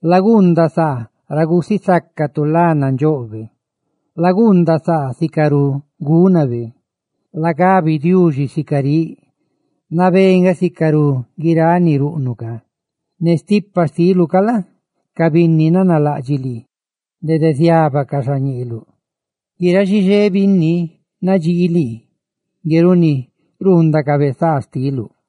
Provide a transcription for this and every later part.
laguundaꞌ saa ra gusisácatu lá nandxóꞌ xtibe; laguundaꞌ saa sicarú gúnabe. Lagabi Diuxi: «Nabé nga sicarú guiráꞌ ni ruꞌnuꞌ. Ne stipa xtiluꞌ ca la? ca binni nanalaꞌdxiꞌ lii dede ziábacaꞌ xañeeluꞌ; guiráꞌ xixé binni nadxii lii, ngue runi ruundacabe saa xtiuꞌ.»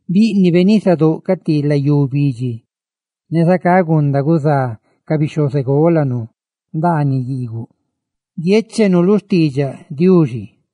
bíꞌnibe nisadóꞌ ca ti layú bidxi, ne zacá gunda gudiꞌdiꞌ ca bixhozególanu ndaaniꞌ guiigu; ¡guiéchenu lu xtiidxaꞌ Diuxi!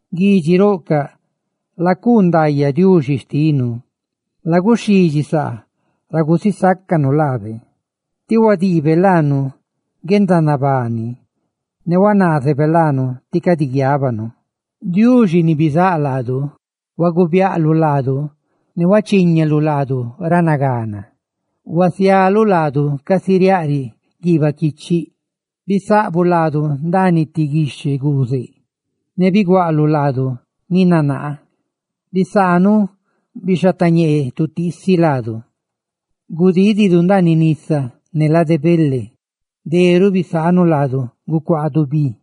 ¡Guidxiroꞌcaꞌ, lacuu ndaayaꞌ Diuxi xtinu!, ¡laguxhidxi saa ra gusisácanu laabe! Tí huadiibe laanu guendanabani; ne qué huazaanabe laanu guiábanu. Diuxi ni bizáꞌ laadu, guluubiaꞌluꞌ laadu ne huachíñalu laadu ra nagana, ¡huasialuꞌ laadu casi riaꞌriꞌ guiibaꞌ quichiꞌ! Bisaꞌbuꞌ laadu ndaaniꞌ ti guixhe guuzeꞌ; biguaꞌluꞌ laadu ni nanaa. Bisaanuꞌ bixhatañee tutiisi laadu; gudididu ndaaniꞌ nisa ne lade bele, deruꞌ bisaanuꞌ laadu gucuaadu bi.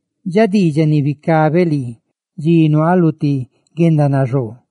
dxa diidxaꞌ ni bicabeꞌ lii dxi nuaaꞌ lu ti guendanaxoo.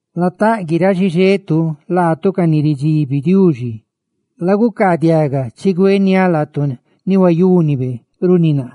¡Lataꞌ guiráꞌ xixetu, laatu ca ni ridxibi Diuxi! ¡Lagucaadiaga, chigüeniáꞌ laatu ni huayúnibe runi naa!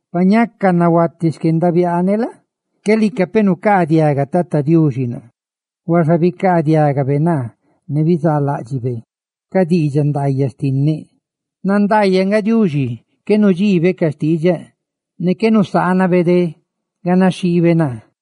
Pa ñaca nahuati xquendabiaaneꞌ la? qué lica nucaadiaga Tata Diuxi naa; ¡huaxa bicaadiagabe naa, ne bizaaláꞌdxibe ca diidxaꞌ ndaayaꞌ xtinneꞌ! ¡Nandaayaꞌ nga Diuxi, qué nudxiibe ca diidxaꞌ ndaayaꞌ xtinneꞌ, ne qué nuzaanabe de ganaxhiibe naa!